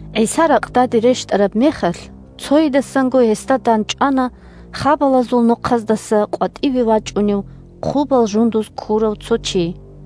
ГӀиса ракъдаде рещтӀараб мехалъ, цойидасанго гьесда дандчӀвана хабалазул нохъаздаса къватӀиве вачӀунев хъубал жундуз ккурав цо чи.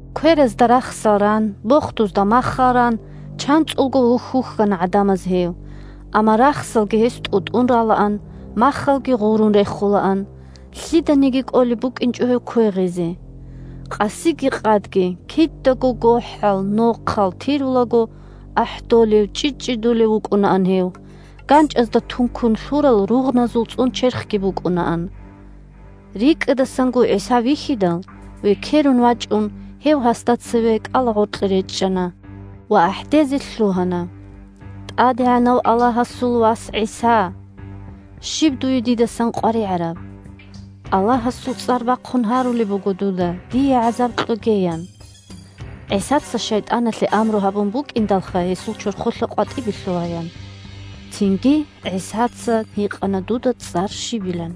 Кверазда рахсал ран, бохдузда маххал ран, чанцӀулго вухь-вухьана гӀадамаз гьев, амма рахсалги гьес тӀутӀун ралаан, маххалги гъурун рехулаан. Лъиданиги кӀолеб букӀинчӀо гьев квегъизе. Къасиги къадги – кидаго гохӀал, нохъал тирулаго ахӀдолев-чӀчӀичӀчӀидулев вукӀунаан гьев, ганчӀазда тункун лъурал ругъназул цӀун черхги букӀунаан. РикӀкӀадасанго ГӀиса вихьидал, векерун вачӀун гьев гьасда цеве кӀалагъоркье речӀчӀана ва ахӀдезе лъугьана: – ТӀадегӀанав Аллагьасул Вас ГӀиса! Щиб дуе дидасан къваригӀараб? Аллагьасул цӀар бахъун гьарулеб буго дуда, дие гӀазаб кьоге! – ян. (ГӀисаца шайтӀаналъе амру гьабун букӀиндалха гьесул чорхолъа къватӀибе лъугьаян.) Цинги ГӀисаца гьикъана дуда цӀар щибилан.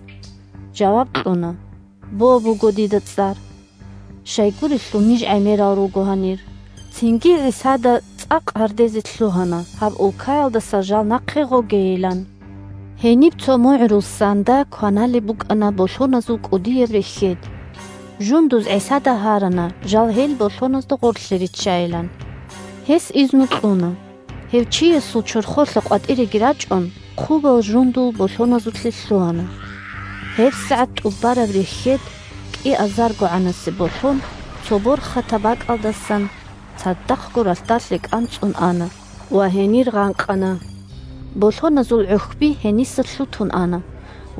Жаваб кьуна: – «Бо» буго дида цӀар. Щайгурелъул ниж гӀемерал руго гьанир. Цинги ГӀисада цӀакъ гьардезе лъугьана, гьаб улкаялдаса жал нахъе гъогейилан. Гьениб цо мугӀрул ссанда кваналеб букӀана болъоназул кӀудияб рехьед. Жундуз ГӀисада гьарана жал гьел болъоназда гъорлъе риччайилан. Гьес изну кьуна. Гьев чиясул чорхолъа къватӀиреги рачӀун, хъубал жундул болъоназулъе лъугьана. ГьебсагӀат тӀубараб рехьед – кӀиазаргогӀанасеб болъон цо борхатаб бакӀалдасан цадахъго ралъдалъе кӀанцӀун ана ва гьенир гъанкъана. Болъоназул гӀухьби гьениса лъутун ана,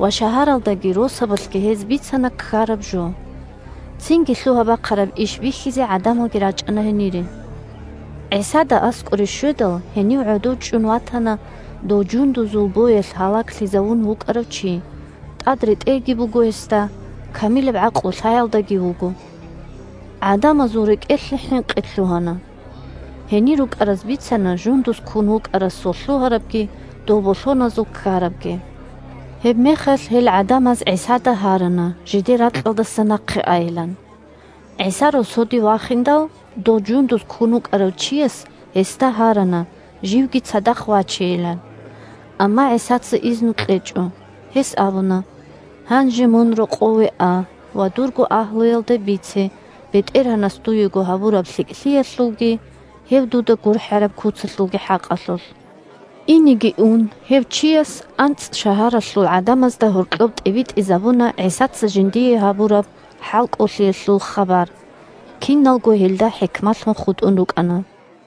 ва шагьаралдаги росабалъги гьез бицана ккараб жо. Цинги лъугьа-бахъараб иш бихьизе гӀадамалги рачӀана гьенире. ГӀисада аскӀоре щведал, гьенив гӀодов чӀун ватана дов жундузул боялъ гьалаглъизавун вукӀарав чи: тӀад ретӀелги буго гьесда, камилаб гӀакълу-лъаялдаги вуго. ГӀадамазул рекӀелъе хӀинкъи лъугьана. Гьенир рукӀараз бицана жундуз ккун вукӀарасул лъугьарабги дол болъоназул ккарабги. Гьебмехалъ гьел гӀадамаз ГӀисада гьарана жидер ракьалдаса нахъе айилан. ГӀиса росоде вахиндал, дов жундуз ккун вукӀарав чияс гьесда гьарана живги цадахъ вачейилан. Амма ГӀисаца изну кьечӀо. Гьес абуна: – Гьанже мун рокъове а ва дурго агьлуялда бице БетӀергьанас дуего гьабураб лъикӀлъиялъулги, гьев дуда гурхӀараб куцалъулги хӀакъалъулъ. Инеги ун гьев чияс АнцӀшагьаралъул гӀадамазда гьоркьоб тӀибитӀизабуна ГӀисаца жиндие гьабураб хӀалкӀолъиялъул хабар. Киналго гьелда хӀикмалъун хутӀун рукӀана.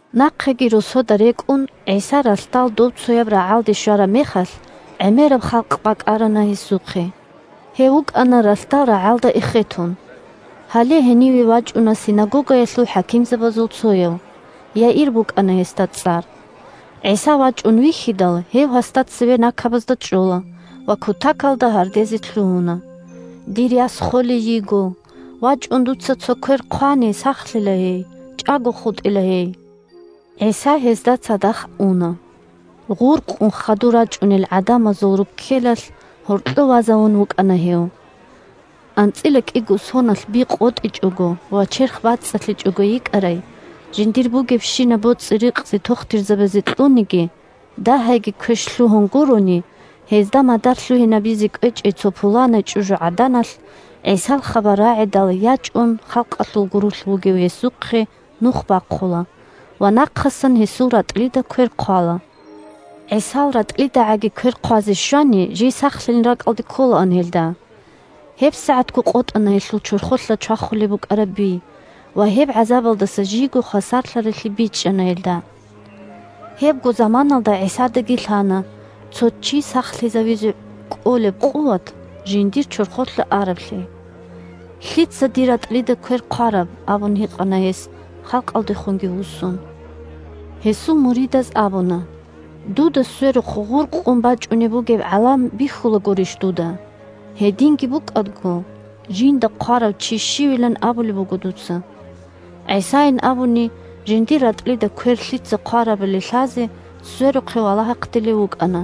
Нахъеги росодаги рекӀун, ГӀиса ралъдал добцояб рагӀалде щвараб мехалъ, гӀемераб халкъ бакӀарана гьесухъе. Гьев вукӀана ралъдал рагӀалда эхетун. Гьале, гьениве вачӀуна синагогаялъул хӀакимзабазул цояв. Яир букӀана гьесда цӀар. ГӀиса вачӀун вихьидал, гьев гьасда цеве накабазда чӀола, ва кутакалда гьардезе лъугьуна: – Дир яс холей йиго, вачӀун дуца цо квер хъвани, сахлъила гьей, чӀаго хутӀила гьей. ГӀиса гьесда цадахъ уна. Гъуркъун хадур рачӀунел гӀадамазул руккелалъ гьоркьов вазавун вукӀана гьев. АнцӀила кӀиго соналъ би къотӀичӀого ва черх бацӀцӀалъичӀого йикӀарай, жиндир бугебщинаб боцӀи-рикъзи тохтирзабазе кьуниги, дагьайги квеш лъугьун гурони, гьезда мадар лъугьинабизе кӀвечӀей цо пуланай чӀужугӀаданалъ, ГӀисал хабар рагӀидал ячӀун, халкъалъул гурулъ вугев гьесухъе нух бахъула ва нахъасан гьесул ратӀлида квер хъвала. ГӀисал ратӀлидагӀаги квер хъвазе щвани, жий сахлъилин ракӀалде кколаан гьелда. ГьебсагӀатго къотӀана гьелъул чорхолъа чвахулеб букӀараб би, ва гьеб гӀазабалдаса жийго хвасарлъарайлъи бичӀчӀана гьелда. Гьебго заманаялда ГӀисадаги лъана цо чи сахлъизавизе кӀолеб къуват жиндир чорхолъа араблъи. – Лъица дир ратӀлида квер хъвараб? – абун гьикъана гьес, халкъалдехунги вуссун. Гьесул муридаз абуна: – Дуда сверухъ гъуркъун бачӀунеб бугеб гӀалам бихьулагурищ дуда. Гьединги букӀаго, жинда хъварав чи щивилан абулеб буго дуца. ГӀисайин абуни, жиндир ратӀлида квер лъица хъварабали лъазе, сверухъе валагьахъдилев вукӀана.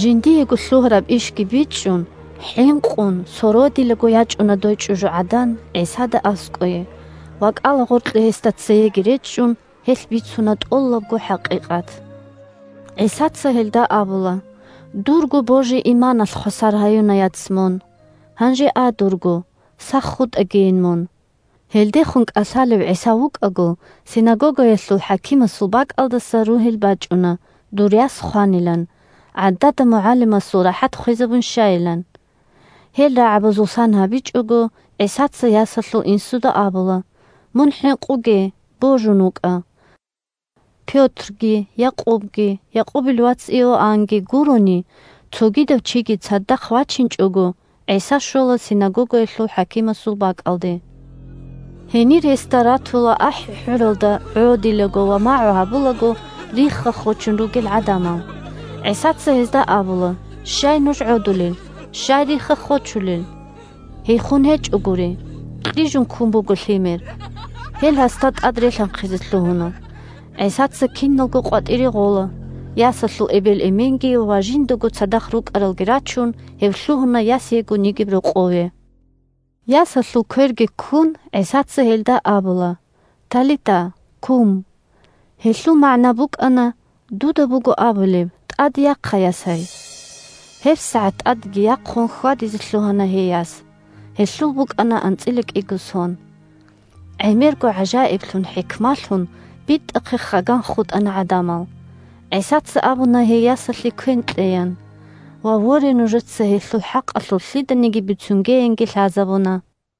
Жиндиего лъугьараб ишги бичӀчӀун, хӀинкъун сородилаго ячӀуна дой чӀужугӀадан ГӀисада аскӀое ва, кӀалагъоркье гьесда цееги речӀчӀун, гьелъ бицуна тӀолабго хӀакъикъат. ГӀисаца гьелда абула: – Дурго божи-иманалъ хвасар гьаюна, яц, мун. Гьанже а дурго, сах хутӀагийин мун! Гьелдехун кӀалъалев ГӀиса вукӀаго, синагогаялъул хӀакимасул бакӀалдаса ругьел бачӀуна, дур яс хванилан, гӀадада МугӀалимасул рахӀат хвезабун щайилан. Гьел рагӀабазул сан гьабичӀого, ГӀисаца ясалъул инсуда абула: – Мун хӀинкъуге, божун вукӀа! Пётрги, Якъубги, Якъубил вац Иоаннги гурони, цогидав чиги цадахъ вачинчӀого, ГӀиса щола синагогаялъул хӀакимасул бакӀалде. Гьенир гьесда ратула ахӀи-хӀуралда гӀодилаго ва магӀу гьабулаго рихха-хочун ругел гӀадамал. ГӀисаца гьезда абула: – Щай нуж гӀодулел? Щай рихха-хочулел? Гьей хун гьечӀогури. Кьижун ккун буго лъимер. Гьел гьасда тӀад релъанхъизе лъугьуна. ГӀисаца киналго къватӀире гъола. Ясалъул эбел-эменги ва жиндаго цадахъ рукӀаралги рачун, гьев лъугьуна яс егун йигеб рокъове. Ясалъул кверги ккун, ГӀисаца гьелда абула: – ТӀелитаъ, кӀум! (Гьелъул магӀна букӀана – «Дуда буго абулеб: ТӀаде яхъа, ясай!») ГьебсагӀат тӀадеги яхъун хьвадизе лъугьана гьей яс. (Гьелъул букӀана анцӀила кӀиго сон.) ГӀемерго гӀажаиблъун-хӀикмалъун, битӀахъе хаган хутӀана гӀадамал. ГӀисаца абуна гьей ясалъе квен кьеян, ва, воре, нужеца гьелъул хӀакъалъулъ лъиданиги бицунгеянги лъазабуна.